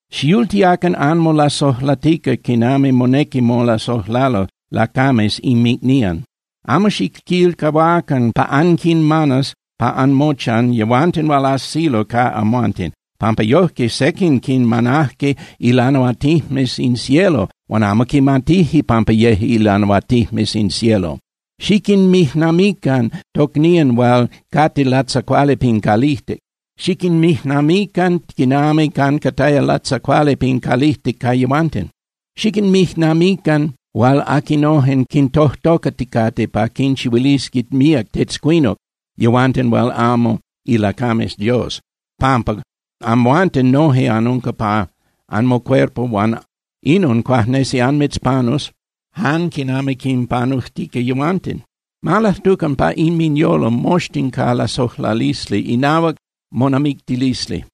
Xiyultiacan anmolasojlatica quinami monequi molasojlalo lacames inmicnían. Amo xiquilcahuacan pa anquinmanas pa anmochan yehuanten hual ajsilo ca amhuanten, pampa yojque sequin quinmanajque ilanahuatinijmes in cielo huan amo quimatijque pampa yeje ilanahuatinijmes in cielo. Xiquinmijnamiquican tocnían hual cate latzacuali pin calijtic. Xiquinmijnamiquican quinami ancataya latzacuali pin calijtic ca yehuanten. Xiquinmijnamiquican hual aquinojen quintojtocaticate pa quinchihuilisqui míac tetzcuinuc yehuanten hual amo ilacames Dios, pampa amhuanten noje anunca pa anmocuerpo huan inon cuajnesi anmitzpanus jan quinami quinpanujtica yehuanten. Ma lajtucan pa inminyolo moxtin ca lasojlalisli inahuac monamictilisli,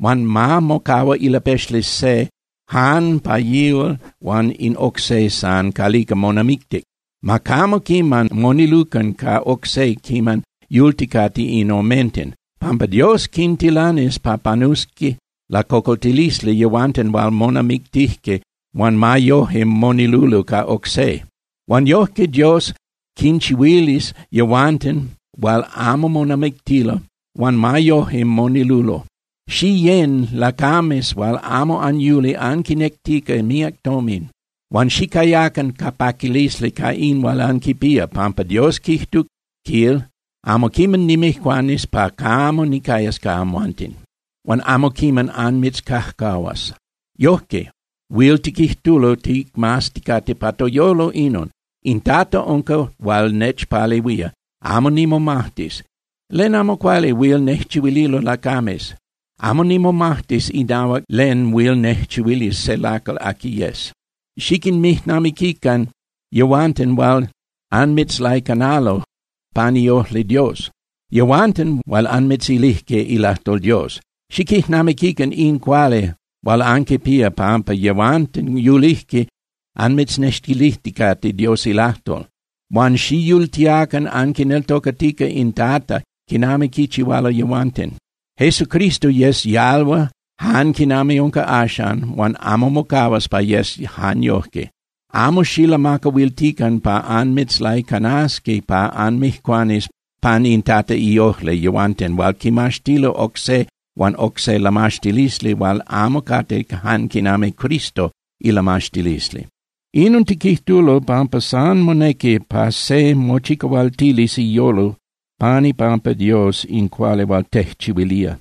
huan ma mocahua ilapexli se jan pa yihual huan in oc se san calica monamictic. Ma camo quiman monilucan ca oc se quiman yulticate in omenten, pampa Dios quintilanis pa panusqui lacocoltilisli yehuanten hual monamictijque huan ma yoje monilulo ca oc se. Huan yojque Dios quinchihuilis yehuanten hual amo monamictilo huan ma yoje monilulo. Xiyén (Xiyecan) lacames hual amo anyuli anquinectica míac tomin, huan xicayacan ca paquilisli ca in hual anquipía, pampa Dios quijtuc, quil: “Amo quiman nimijcuanis pa camo nicayas ca amhuanten, huan amo quiman annimitzcajcahuas.” Yojque, huil tiquijtulo ticmazticate pa toyolo inon: In Tata unca hual nechpalehuía; amo nimomajtis. ¿Len amo cuali huil nejchihuililo lacames? Amo nimomajtis inahuac len huil nejchihuilis se lacal aqui yes. Xiquinmijnamiquican yehuanten hual anmitzlaicanalo pan iojli Dios, yehuanten hual anmitzilijque ilajtol Dios. Xiquijnamiquican in cuali hual anquipía pampa yehuanten yulijque anmitznextilijticate Dios ilajtol. Huan xiyultiacan anquineltocatica in Tata quinami quichihualo yehuanten. Jesucristo yec yalhua jan quinami unca axcan huan amo mocahuas pa yes jan yojque. Amo xilamacahuiltican pa anmitzlaicanasqui pa anmijcuanis pan in Tata iojli yehuanten hual quimaxtilo oc se huan oc se lamaxtilisli hual amo cate jan quinami Cristo ilamaxtilisli. Inon tiquijtulo pampa san monequi pa se mochicahualtilis iyolo pan ipampa Dios in cuali hual tejchihuilía.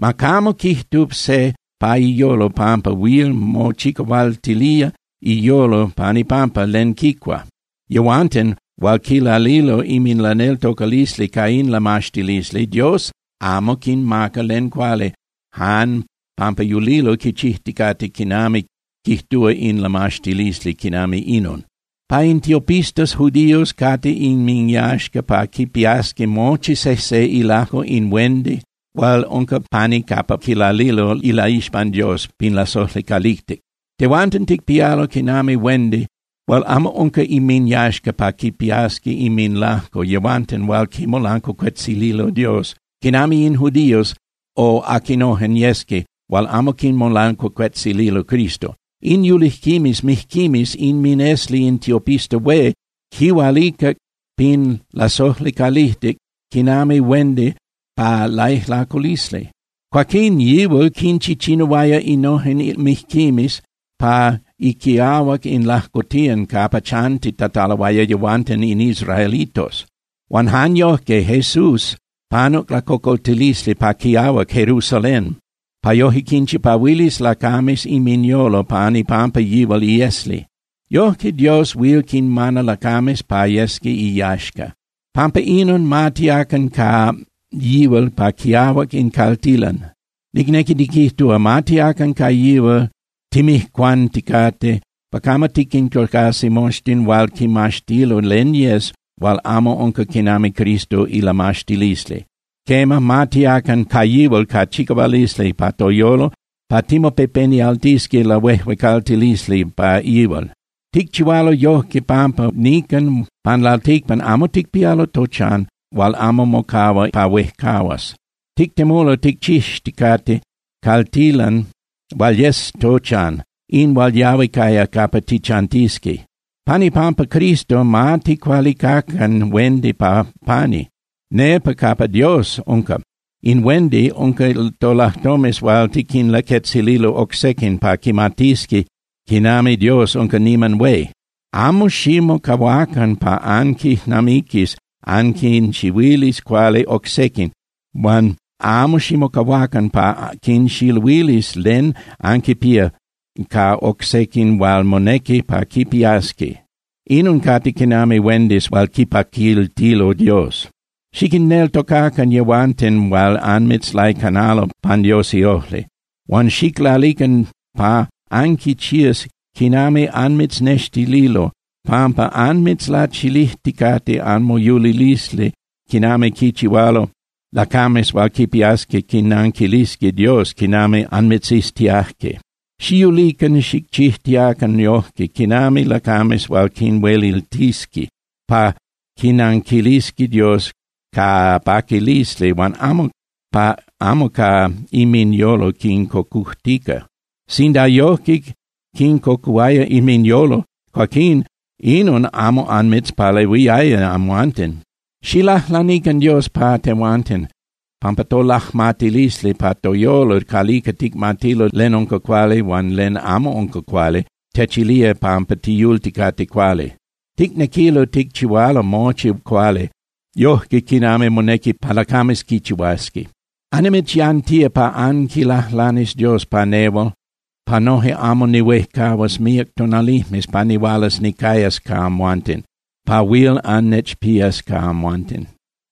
Ma camo quijtu se pa iyolo pampa huil mochicahualtilía iyolo pan ipampa len quicua. Yehuanten hual quilalilo inminlaneltocalisli ca in lamaxtilisli, Dios amo quinmaca len cuali jan pampa yulilo quichijticate quinami quijtúa se lamaxtilisli quinami inon. Pa in tiopistas judíos cate inminyaxca pa quipiasqui mochi sejse ilajco in huendi hual unca pani capa quilalilo ilaixpan Dios pin lasojli calijtic. Tehuanten ticpialo quinami huendi hual amo unca inminyaxca pa quipiasqui inminlajco yehuanten hual quimolancuacuetzililo Dios quinami in judíos o aquinojen yesqui hual amo quimolancuacuetzililo Cristo. In yulijquimes mijquimes inminesli in tiopista hué quihualicac pin lasojli calijtic quinami huendi pa laijlaculisli. Cuaquín yihual quinchichinuaya innojen mijquimes pa iquiahuac in lajcotiyan capa chantitataloaya yehuanten in israelitos. Huan jan yojque Jesús panuc lacocoltilisli pa quiahuac Jerusalén pa yoje quinchipahuilis lacames inminyolo pan ipampa yihual iesli. Yoje Dios huil quinmana lacames pa yesqui iyaxca. Pampa inon ma tiacan ca yihual pa quiahuac in caltilan, nicnequi niquijtúa, ma tiacan ca yihual timijcuanticate pa camo tiquintocasi moxtin hual quimaxtilo len yes hual amo unca quinami Cristo ilamaxtilisli. Quema, ma tiacan ca yihual ca chicahualisli pa toyolo pa timopepenialtisqui lahuejuecaltilisli pa yihual. Ticchihualo yojque pampa nican pan lalticpan amo ticpialo tochan hual amo mocahua pa huejcahuas. Tictemulo ticchixticate caltilan hual yes tochan, in hual yahui caya capa tichantisqui. Pan ipampa Cristo, ma ticualicacan huendi pa pani, nepa capa Dios unca. In huendi unca tolajtomes hual tiquinlaquetzililo oc sequin pa quimatisqui quinami Dios unca niman hué. Amo ximocahuacan pa anquijnamiquis anquinchihuilis cuali oc sequin. Huan amo ximocahuacan pa anquinxiluilis len anquipía ca oc sequin hual monequi pa quipiasqui. Inon cate quinami huendis hual quipaquiltilo Dios. Xiquinneltocacan yehuanten hual anmitzlaicanalo pan Dios iojli, huan xiclalican pa anquichías quinami anmitznextililo, pampa anmitzlachilijticate anmoyulilisli quinami quichihualo lacames hual quipiasqui quinanquilisqui Dios quinami anmitziztiajque. Xiyulican xicchijtiacan yojque quinami lacames hual quinhueliltisqui pa quinanquilisqui Dios ca paquilisli huan amo ca inminyolo quincocujtica. Sinda yojque quincocuhuaya inminyolo, cuaquín inon amo anmitzpalehuiaya amhuanten. Xiclajlanican Dios pa tehuanten, pampa tolajmatilisli pa toyolo calica ticmatilo len unca cuali huan len amo unca cuali techilía pampa tiyulticate cuali. Ticnequilo ticchihualo mochi cuali yojque quinami monequi pa lacames quichihuasqui. Annimitzyantía pa anquilajlanis Dios pa nehual pa yoje amo nihuejcahuas míac tonalijmes pa nihualas nicayas ca amhuanten, pa huil annechpías ca amhuanten.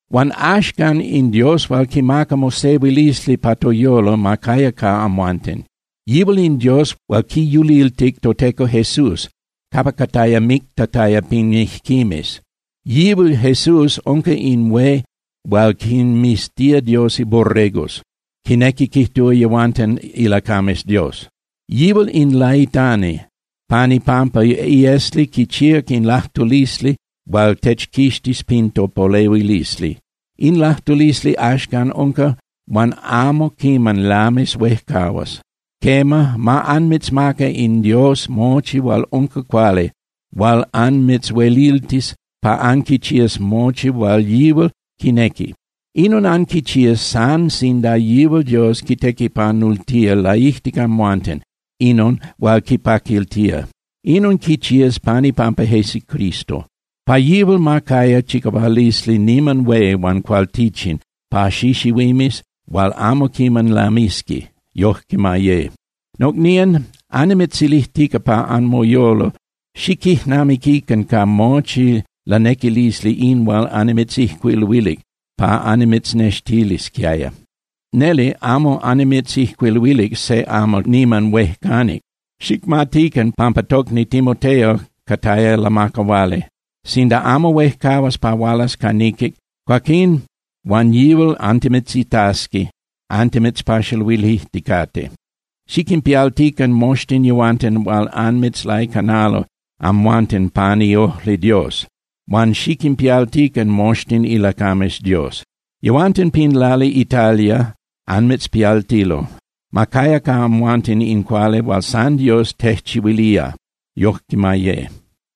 Huan axcan, in Dios hual quimaca mosehuilisli pa toyolo ma caya ca amhuanten. Yihual in Dios hual quiyuliltic toTeco Jesús capa cataya mictataya pin mijquimes. Yihual Jesús unca in hué hual quinmiztía Dios iborregos, quinequi quijtúa yehuanten ilacames Dios. Yihual in laitani, pan ipampa iesli quichíac in lajtulisli hual techquixtis pin topolehuilisli. In lajtulisli axcan unca huan amo quiman lamis huejcahuas. Quema, ma anmitzmaca in Dios mochi hual unca cuali hual anmitzhueliltis pa anquichías mochi hual yihual quinequi. Inon anquichías san sinda yihual Dios quitequipanultía laijtic amhuanten inon hual quipaquiltía. Inon quichías pan ipampa Jesucristo. ¡Pa yihual ma caya chicahualisli niman hué huan cualtichin pa xixihuimes hual amo quiman lamisqui! Yojque ma ye. Nocnían, annimitzilijtica pa anmoyolo, xiquijnamiquican ca mochi lanequilisli in hual annimitzijcuiluilic pa annimitznextilisquiaya. Neli amo annimitzijcuiluilic se amal niman huejcanic. Xicmatican pampa tocni Timoteo cataya lamacahuali. Sinda amo huejcahuas pa hualas ca niquic, cuaquín huan yihual antimitzitasqui antimitzpaxaluilijticate. Xiquinpialtican moxtin yehuanten hual anmitzlaicanalo amhuanten pan iojli Dios, huan xiquinpialtican moxtin ilacames Dios. Yehuanten pin lali Italia anmitzpialtilo. Ma caya ca amhuanten in cuali hual san Dios tejchihuilía. Yoque ma ye.